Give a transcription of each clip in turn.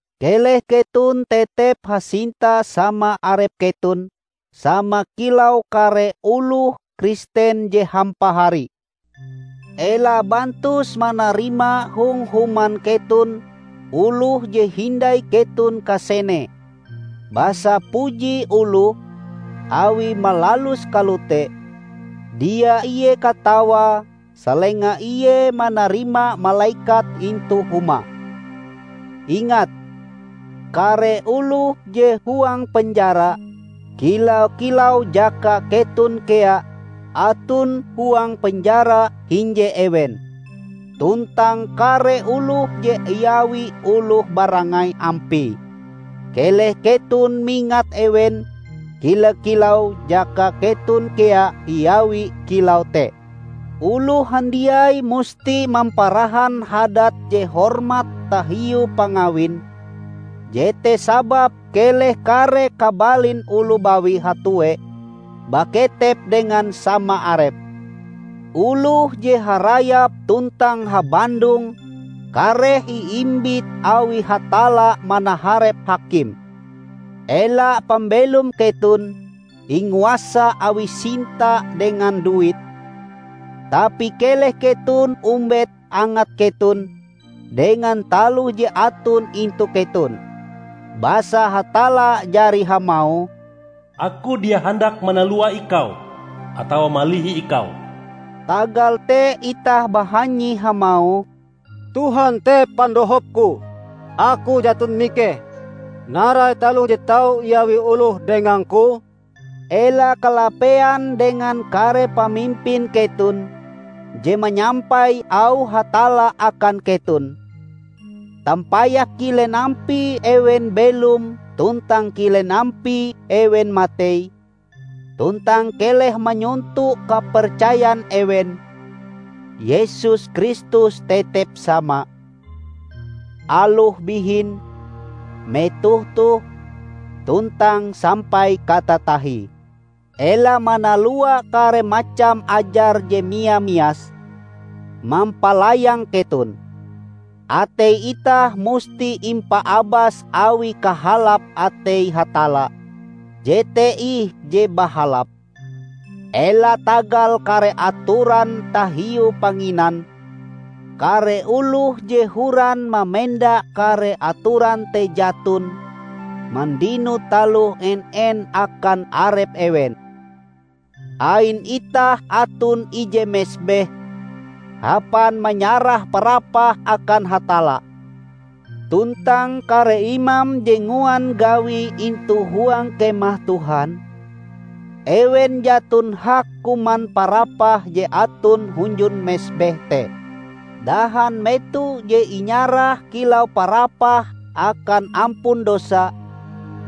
Keleh keton tetep hasinta sama arep keton sama kilau kare oloh Kristen je hampahari. Ela bantus manarima hong human keton oloh je hindai keton kasenee. Basa puji oloh, awie malalus kalote, dia ie katawae salenga ie manarima malekat intu humae. Ingat kare oloh je huang penjara, kila-kilau jaka keton kea aton huang penjara hinje ewen. Tuntang kare oloh je iawi oloh barangai ampie, keleh keton mingat ewen kila-kilau jaka keton kea iawi kilau te. Oloh handiai musti mamparahan hadat je hormat tahiu pangawin, jete sababe keleh kare kabalin oloh bawi hatue baketep dengan sama arepe. Oloh je harayap tuntang habandong kareh iimbit awi Hatalla manaharep hakim. Ela pambelom keton inguasa awi sinta dengan duit, tapi keleh keton ombet angat keton dengan taloh je aton intu keton. Basa Hatalla jari hamauh, "Aku dia handak manalua ikau atawa malihi ikau." Tagal te itah bahanyi hamauh, "Tuhan te Pandohopku, aku jaton mikeh. Narai taloh je tau iawi oloh dengangku?" Ela kalapean dengan kare pamimpin keton je manyampai auh Hatalla akan keton. Tampayah kilen ampie ewen belom tuntang kilen ampie ewen matei, tuntang keleh manyonto kapercayan ewen. Yesus Kristus tetep sama, aloh bihin, metoh toh, tuntang sampai katatahie. Ela manalua kare macam ajar je mia-mias mampalayang keton. Atei itah musti impaabas awi kahalap atei Hatalla, jete ih je bahalap; ela tagal kare atoran tahiu panginan. Kare oloh je horan mamenda kare atoran te jaton mandino taloh en-en akan arep ewen. Ain itah aton ije mesbeh hapan manyarah parapah akan Hatalla. Tuntang kare imam je nguan gawie intu huang Kemah Tuhan, ewen jaton hak kuman parapah je aton hunjun mesbeh te. Dahan meto je inyarah kilau parapah akan ampun dosa,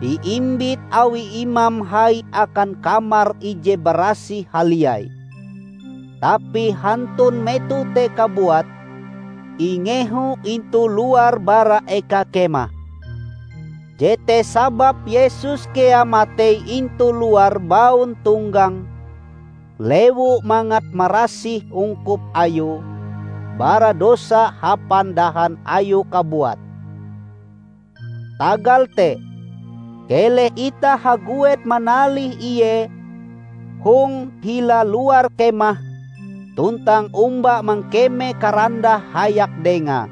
iimbit awi imam hai akan Kamar Ije Barasih Haliai, tapi hantun meto te kabuat ingeho intu luar bara eka kemah. Jete sababe Yesus kea matei intu luar bauntonggang lewu mangat marasih ungkup ayue bara dosa hapan dahan Ayue kabuat. Tagal te, keleh itah haguet manalih Ie hong hila luar kemah tuntang omba mangkeme karandah hayak Dengae.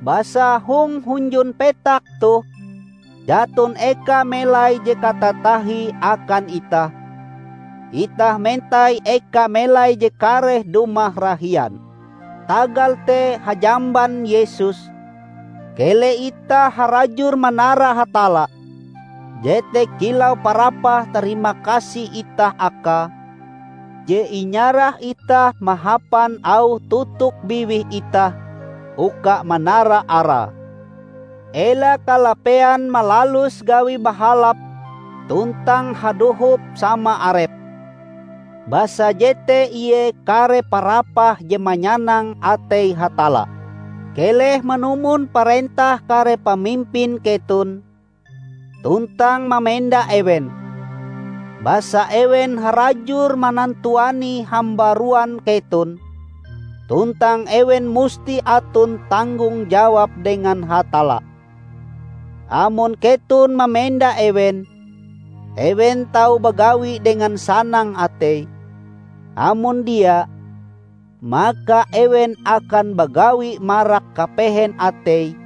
Basa hong hunjun petak toh jaton eka melai je katatahie akan itah; itah mentai eka melai je kareh dumah rahian. Tagal te hajamban Yesus, keleh itah harajur manara Hatalla; jete kilau parapah tarimakasih itah Akae, je inyarah itah mahapan auh totok biwih itah uka manara Arae. Ela kalapean malalus gawi bahalap tuntang hadohop sama arep, basa jete ie kare parapah je manyanang atei Hatalla. Keleh manumon parentah kare pamimpin keton, tuntang mamenda ewen. Basa ewen harajur manantuani hambaruan keton, tuntang ewen musti aton tanggong jawab dengan Hatalla. Amon keton mamenda ewen, ewen tau bagawi dengan sanang atei; amon dia, maka ewen akan bagawi marak kapehen ateie,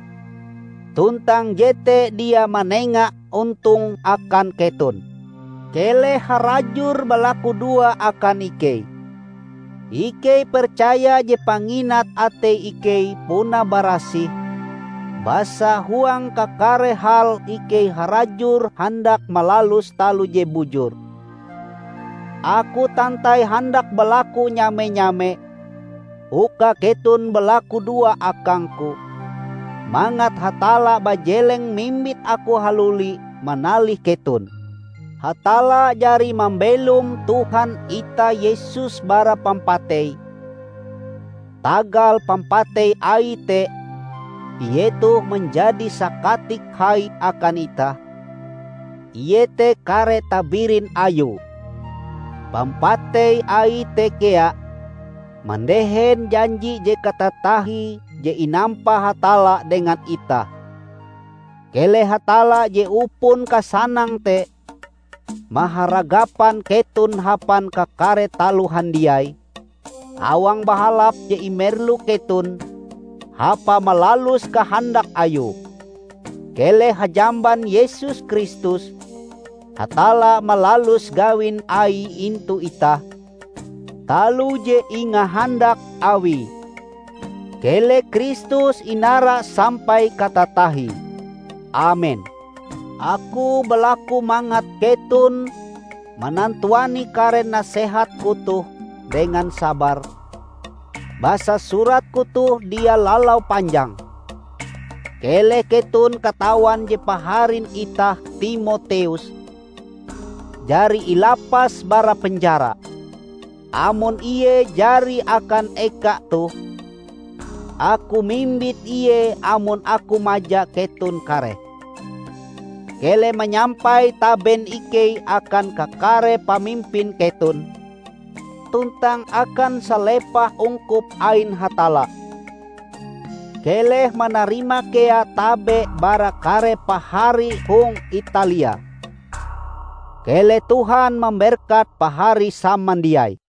tuntang jete dia manenga ontong akan keton. Keleh harajur balakudoa akan ikei. Ikei percaya je panginat atei ikei puna barasih, basa huang kakare hal ikei harajur handak malalus taloh je bujur. Aku tantai handak balaku nyame-nyame, uka keton balakudoa akangku mangat Hatalla bajeleng mimbit aku haluli manalih keton. Hatalla jari mambelom Tuhan itah Yesus bara pampatei. Tagal pampatei Aie te Ie toh manjadi Sakatik Hai akan itah, iete kare tabirin Ayue. Pampatei Aie te kea mandehen janji je katatahie je inampa Hatalla dengan itah. Keleh Hatalla je upon kasanang te maharagapan keton hapan kakare taloh handiai awang bahalap je imerlu keton hapa malalus kahandak Ayue. Keleh hajamban Yesus Kristus, Hatalla malalus gawin Aie intu itah taloh je ingahandak Awie. Keleh Kristus inara sampai katatahie! Amen. Aku balaku mangat keton manantuani kare nasehatku toh dengan sabar, basa suratku toh dia lalau panjang. Keleh keton katawan je paharin itah Timoteus jari ilapas bara penjara. Amon ie jari akan eka toh, aku mimbit ie amon aku maja keton kareh. Keleh manyampai taben ikei akan kakare pamimpin keton tuntang akan salepah ungkup ain Hatalla. Keleh manarima kea tabe bara kare pahari hong Italia. Keleh Tuhan mamberkat Pahari samandiai.